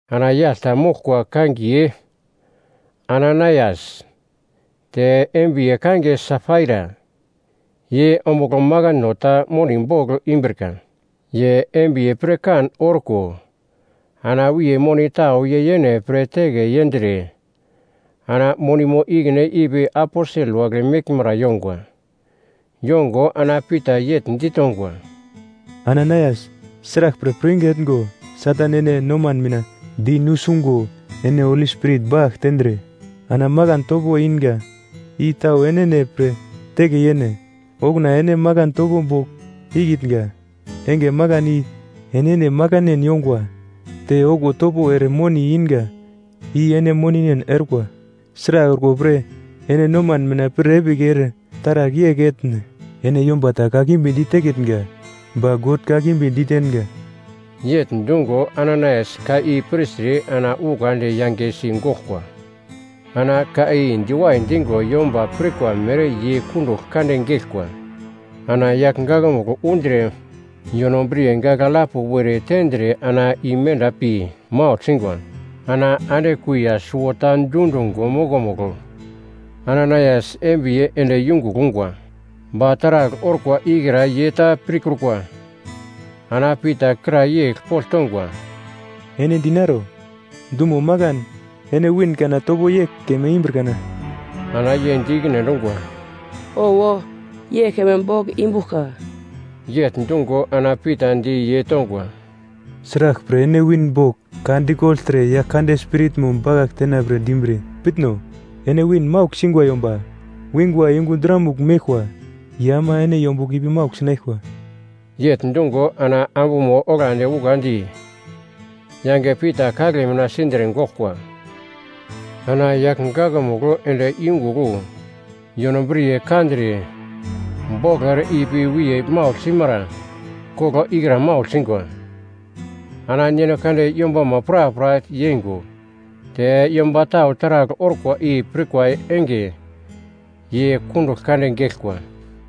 Ana yagl ta moglkwa kangiye Ananaias te embiye kangiye Safaira. Ye ombugl makano ta moni bogl imbrika. Ye embiye pirkan orko ana wiye moni tau ye yene pre teke yendre ana monimo ikine ipi Aposel wagle meglmara yongwa. Yongo ana Pita yegl ditongwa, “Ananaias, sraglpre pirwinge etngo Satan ene noman mina di nusungo ene Holi Spirit bakagl tendre ana makan topo inga i tau enene pre teke yene? Okuna ene makan topo bogl ikitnga enge makan i enene makanen yongwa. Te okuwo topo ere moni inga i ene moninen orkwa. Sragl orko pre ene noman mina pir epigl ere taragl yegl etne? Ene yomba ta kakimbi ditekitnga, ba God kakimbi ditenga!” Yegl dungo Ananaias ka i pirtre ana ukandi yangesi goglkwa. Ana ka i diwai dingo yomba pirkwa mere ye kundugl kande geglkwa. Ana yagl gakmugl undre yonobriye gagl alap were tendre ana imenda pi maugl singwa. Ana ande kuiya suwota dundungo mokomugl Ananaias embiye ende yungugl ungwa, ba taragl orkwa ikra ye ta pirkrukwa. Ana Pita kra yegl pogl tongwa, “Ene dinaro, dumo makan ene win kana topo yegl keme imbir kana?” Ana ye di ikine endungwa, “Owo, yegl keme bogl imbuglka.” Yegl dungo ana Pita di ye tongwa, “Sraglpre ene win bogl ka dikogltre Yaglkande Spiritmo bakagl tenapre dimbre? Pitno, ene win maugl singwa yomba wingwa yungu dramugl meglkwa, ye ama ene yombugl ipi maugl sinaglkwa.” Yegl dungo ana ambumo oglandi ukandi yange Pita kagle mina sindre goglkwa. Ana yagl gakmugl ende yungugl wu yonobriye kandre boglo ere ipi wiye maugl simara koglo ikra maugl singwa. Ana God yombama prapra yeingo te yomba tau taragl orkwa i pirkwa enge ye kundugl kande geglkwa.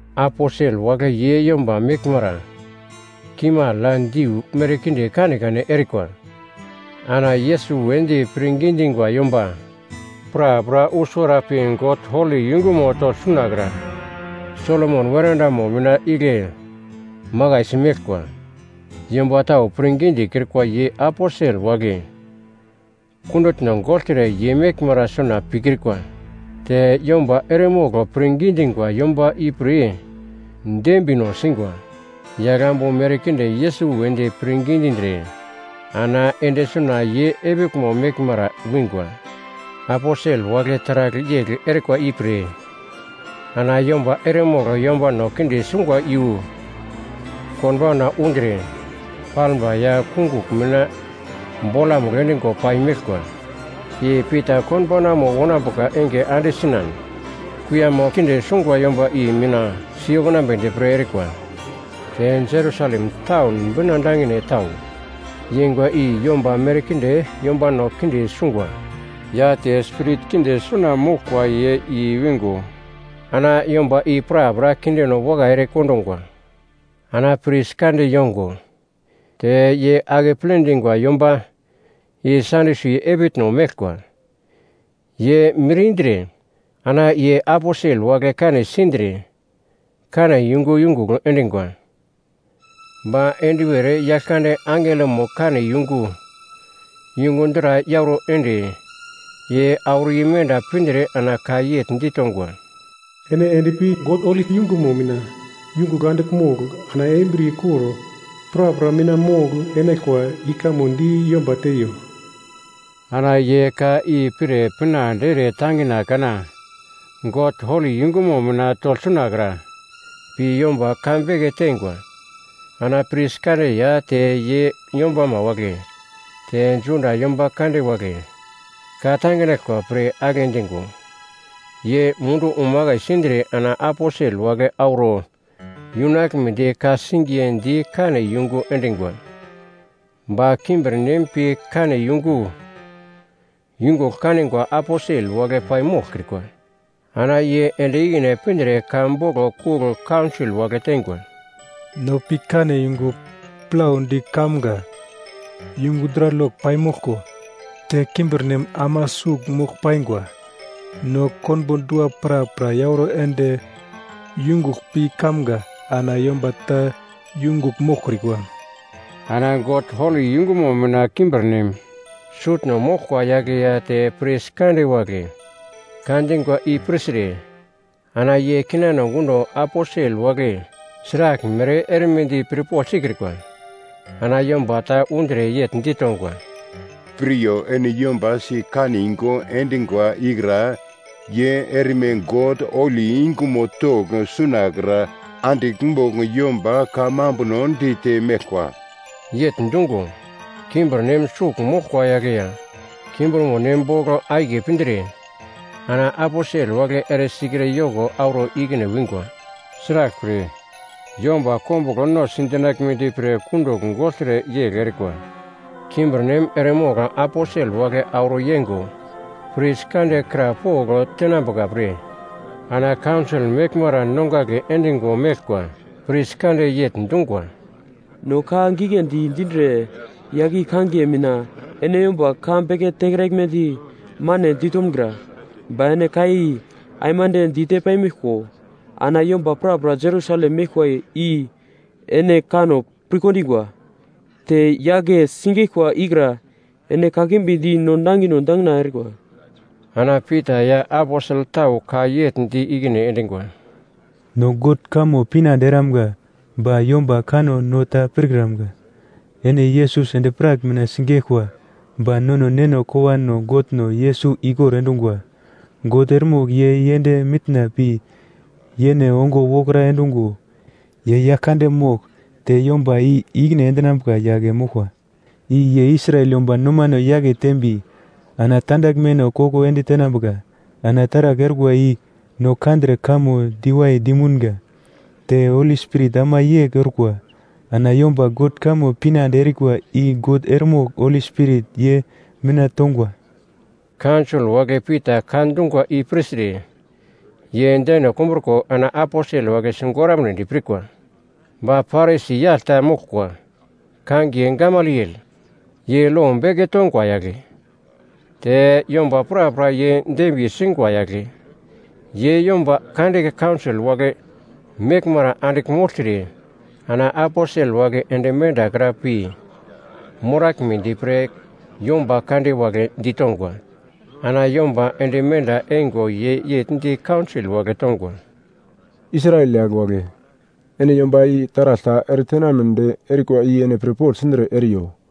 Aposel wagle ye yomba meglmara kimagl ya diu merkinde kanekane erikwa. Ana Yesus wedi pirngi dingwa yomba prapra wu suwara pi God holi yungumo togl sunakra Solomon weradamo mina igle makaisi meglkwa. Yomba tau pirngi dikrikwa ye aposel wagle kundutno gogltre ye meglmara suna pikrikwa. Te yomba eremogl pirngi dingwa yomba ipre dembino singwa. Yagl ambu merkinde Yesus wedi pirngi dindre ana ende suna ye epiglmo meglmara wingwa. Aposel wagle taragl yegl erikwa ipre ana yomba eremogl yombano kinde sungwa iyu konbauna undre, palmba ya kungugl mina bolamugl endingo pai meglkwa. I Pita konbaunamo wonambuka enge ande sinan, kuiyamo kinde sungwa yomba i mina siyokunambedi pre erikwa. Te Jerusalem taun bina dangine tau yeingwa i yomba merkinde yombano kinde sungwa ya te spirit kinde suna moglkwa ye i-wingo ana yomba i prapra kindeno wakai erekondungwa. Ana pris kande yongo te ye akeple dingwa yomba i Sadyusi epitno meglkwa, ye mir indre, ana ye Aposel wagle kane sindre kane yungu yungugl endingwa. Ba enduwer Yaglkande angelomo kane yungu, yungu dra yauro ende ye auro imenda pindre ana ka yegl ditongwa, “Ene endpi God holi yungumo mina yungugl andigl mogl ana embriye kor prapra mina mogl-enaglkwa i kamo di yomba teiyo.” Ana ye ka i pir pinande ere tangina kana God holi yungumo mina togl sunakra pi yomba ka beke teingwa. Ana pris kande ya te ye yombama wagle, te Juda yomba kande wagle ka-tanginaglkwa pre agle dingo ye mundu umakai sindre ana aposel wagle auro yunaglmedi ka-singiye di kane yungu endingwa. Ba kimbirnem pi kane yungu yungugl kanigwa aposel wagle paimoglkrikwa, ana ye ende ikine pindre ka boglo kugl kaunsol wagle teingwa, “No pi kane yungu plaudi kamga yungu dra lok paimoglko te kimbirnem ama sugl mogl paingwa. No konbo dua prapra yauro ende yungugl pi kamga ana yomba ta yungugl moglkrikwa.” Ana God holi yungumo mina kimbirnem sutno moglkwa yagle ya te pris kande wagle ka dingwa i pirtre, ana ye kinano gundo aposel wagle sraglmere erimedi pirpogl sikrikwa. Ana yomba ta undre yegl ditongwa, “Piryo, ene yomba sikane yungu endingwa ikra ye erme God holi yungumo togl sunakra andigl mogl yomba kamambuno dite meglkwa.” Yegl dungo, kimbirnem sugl moglkwa yagle ya kimbirmonem bogl akiye pindre, ana aposel wagle eresikre yoko auro ikine wingwa. Sraglpre, yomba kombuglo no sidinaglmedi pre kundugl gogltre yegl erikwa. Kimbirnem eremogl aposel wagle auro yengo pris kande kra pogl tenambuka pre ana kaunsol meglmara nongagle endingo meglkwa. Pris kande yegl dungwa, “No ka giglendi dindre yagl i kangiye mina ene yomba ka beke tekraglmedi mane ditomgra. Ba ene ka i aimande dite paimeglko ana yomba prapra Jerusalem meglkwa i ene kanno pirkondingwa, te yagle sigeglkwa ikra ene kakimbi di no nangino dangina erikwa.” Ana Pita ya aposel tau ka yegl di ikine endingwa, “No God kamo pinande eramga ba yomba kanno no ta pirkramga. Ene Yesus endi-prak mina sigeglkwa ba nono neno kowano Godno Yesus ikor endungwa. God eremogl ye yend mitna pi yene ongo wokra endungo, ye yagl kande mogl te yomba i-ikine endinambuka yagle moglkwa, i ye Israel yomba nomano yake tembi ana tandaglmeno koko ende tenambuka. Ana taragl orkwa i no kandre kamo diwai dimunga, te Holi Spirit ama yegl orkwa. Ana yomba God kamo pinande erikwa i God eremogl Holi Spirit ye mina tongwa.” Kaunsol wagle Pita ka dungwa i pirtre ye deno kumbruko ana aposel wagle sigoramnedi pirkwa. Ba Parisi yagl ta moglkwa kangiye Gamaliel, ye lo beke tongwa yagle, te yomba prapra ye dembiye singwa yagle. Ye yomba kande kaunsol wagle meglmara andigl mogltre ana aposel wagle ende mendakra pi moraglmedi pre yomba kande wagle ditongwa. Ana yomba ende menda eingo ye yegl di kaunsol wagle tongwa, “Israel yagl wagle, ene yomba i taragl ta eretenamnedi erikwa i ene pirpogl sindre eriyo.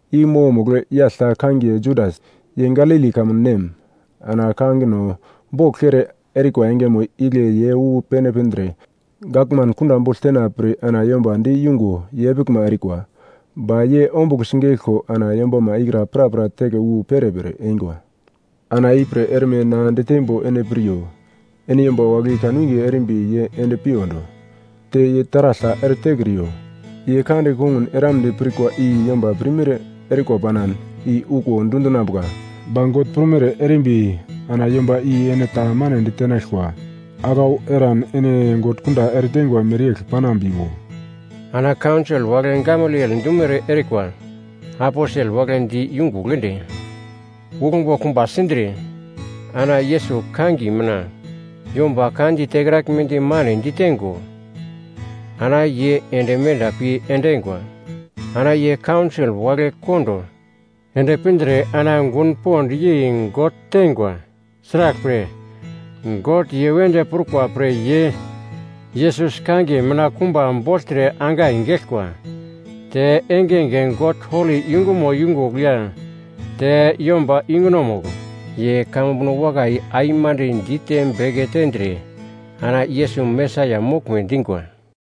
I mokomugl yagl ta kangiye Judas, ye Galili kamun nem. Ana kangino bogl kere erikwa engemo igle ye wu pene pindre gavman kunda bogl tenapre ana yomba di yungo ye epiglma erikwa. Ba ye ombugl sigeglko ana yombama ikra prapra teke wu perepere eingwa. Ana ipre erme na diteimbo ene piryo: Ene yomba wagle i kanwinge erimbi ye ende piyondo, te ye taragl ta eretekriyo. Ye ka di kongun eramnedi pirkwa i yomba pirmere erikwa panan i okuwo dundinambuka. Ba God prumere erimbi ana yomba i ene ta mane ditenaglkwa. Aglau eran ene God kunda ereteingwa mereyegl panambiwo.” Ana kaunsol wagle Gamaliel dumere erikwa. Aposel wagle di yungugl ende uglmbo kumba sindre, ana Yesus kangiye mina yomba ka di tekraglmedi mane diteingo ana ye ende menda pi endingwa. Ana ye kaunsol wagle kondo ende pindre ana gun pond yei God teingwa; sraglpre, God ye wedi prukwa pre ye Yesus kangiye mina kumba bogltre angai geglkwa. Te engenge God holi yungumo yungugl ya te yomba yungunomugl ye kamambuno wakai aimande dite beke tendre ana Yesus Mesaia moglme dingwa.